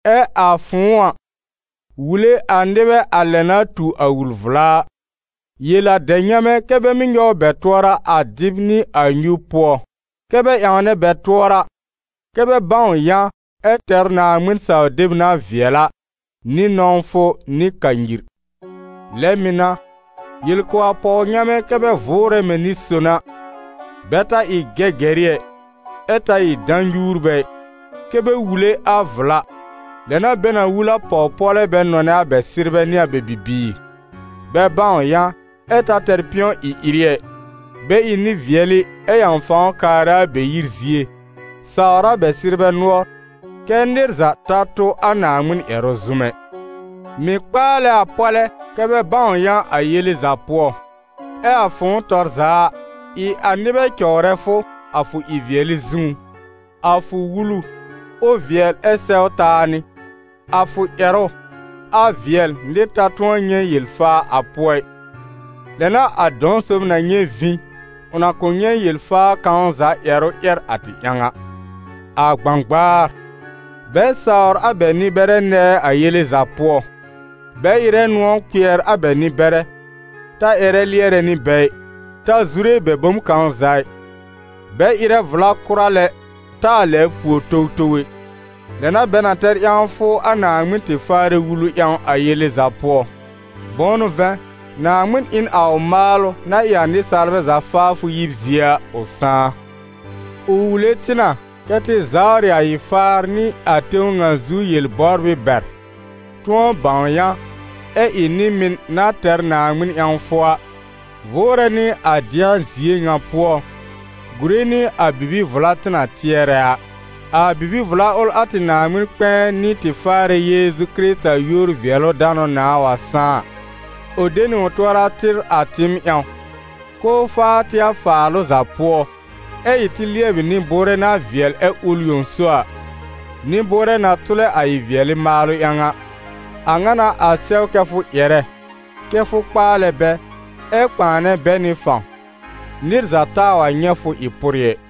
Ɛ a fʋ̃ʋ a, wule a nɩbɛ a lɛ na tu a wul-vla a. Yel a dɛb-nyamɛ kɛ́ bɛ mɩ́ nyɔw bɛ tʋɔra a dɩb nɩ a nyub pʋɔ, kɛ́ bɛ ƴãwnɛ bɛ tʋɔra, kɛ́ bɛ bãw yã, ɛ tɛr Naaŋmɩn-saw-deb na vɩɛl a, nɩ nɔ̃wfʋ nɩ kanyir. Lɛ mɩ̀ n'a, yel kʋ̀ a pɔw-nyamɛ kɛ́ bɛ vʋʋrɛ mɛ̃ nɩ-son a; bɛ ta ɩ gɛgɛrɩ ɛ, ɛ ta ɩ dã-nyuurbɛ ɩ. Kɛ́ bɛ wule a vla, lɛ n'a bɛ na wul a pɔw-pɔ́lɛ́ bɛ nɔnɛ a bɛ sɩrbɛ nɩ a bɛ bibiir, bɛ bãw yã, ɛ ta tɛr pɩ̃ɔ ɩ-ɩrɩ ɛ, bɛ ɩ nɩ-vɩɛlɩ ɛ ƴãw fãw kaarɛ a bɛ yir zie, sawr a bɛ sɩrbɛ nʋɔr, kɛ́ nɩr za ta tʋ a Naaŋmɩn ƴɛrʋ zʋm ɛ. Mɩ̀ kpaalɛ a pɔ́lɛ́ kɛ́ bɛ bãw yã a yele za pʋɔ. Ɛ a fʋ̃ʋ tɔr za a, ɩ a nɩbɛ cɔwrɛ fʋ, a fʋ ɩ-vɩɛlɩ zũú: a fʋ wulu, ʋ vɩɛl ɛ sɛw taa nɩ. A fʋ ƴɛrʋ, a vɩɛl, nɩr ta tʋ̃ɔ nyɛ̃ yel-faa a pʋɔ ɩ, lɛ n'a a dɔ̃-sob na nyɛ̃ vĩ, ʋ na kʋ̃ nyɛ̃ yel-faa kãw za ƴɛrʋ ƴɛr a tɩ ƴãw a. A gbãgbaar, bɛ sawr a bɛ nɩ-bɛrɛ nɛɛ a yele za pʋɔ. Bɛ ɩrɛ nʋ̃ɔ̀ kpɩɛr a bɛ nɩ-bɛrɛ: ta ƴɛrɛ lɩɛrɛ nɩ bɛ ɩ, ta zure bɛ bom kãw za ɩ. Bɛ ɩrɛ vla kʋra lɛ taa lɛbr pùor towtow ɛ; lɛ n'a bɛ na tɛr ƴãwfʋ a Naaŋmɩn tɩ Faarɛ wulu ƴãw a yele za pʋɔ. Bʋ̃ʋ n'ʋ vɛ̃, Naaŋmɩn ɩ n a ʋ maalʋ, na ɩ a nɩsaalbɛ za faafʋ yib zie a, ʋ sãá. Ʋ wule tɩ na kɛ tɩ zawrɩ a ɩ-faar nɩ a tẽw ŋa zu yel-bɔbrɩ bɛr, tʋ̃ɔ bãw yã, ɛ ɩ nɩ-mɩn na tɛr Naaŋmɩn ƴãwfʋ a, vʋʋrɛ nɩ a dɩ̃a zie ŋa pʋɔ, gùre nɩ a bibi-vla tɩ na tɩɛrɛ a. A bibi-vla ʋl a tɩ Naaŋmɩn-kpɛ̃ɛ nɩ tɩ Faarɛ Yeezu Kɩrɩta yúor-vɩɛlʋ-danʋ nãà wa sãá a. Ʋ de nɩ ʋ tʋɔra tɩr a tɩɩm ƴãw, k'ʋʋ faa tɩ a faalʋ za pʋɔ, ɛ́ ɩ tɩ lɩɛbɩ nɩ-bʋʋrɛ na vɩɛl ɛ́ ʋl yõ so a, nɩ-bʋʋrɛ na tʋlɛ a ɩ-vɩɛlɩ maalʋ ƴãw a. A ŋa n'a a sɛw kɛ́ fʋ ƴɛrɛ, kɛ́ fʋ kpaalɛ bɛ, ɛ kpãanɛ bɛ nɩ fãw. Nɩr za taa wa nyɛ̃ fʋ ɩ pʋrɩ ɛ.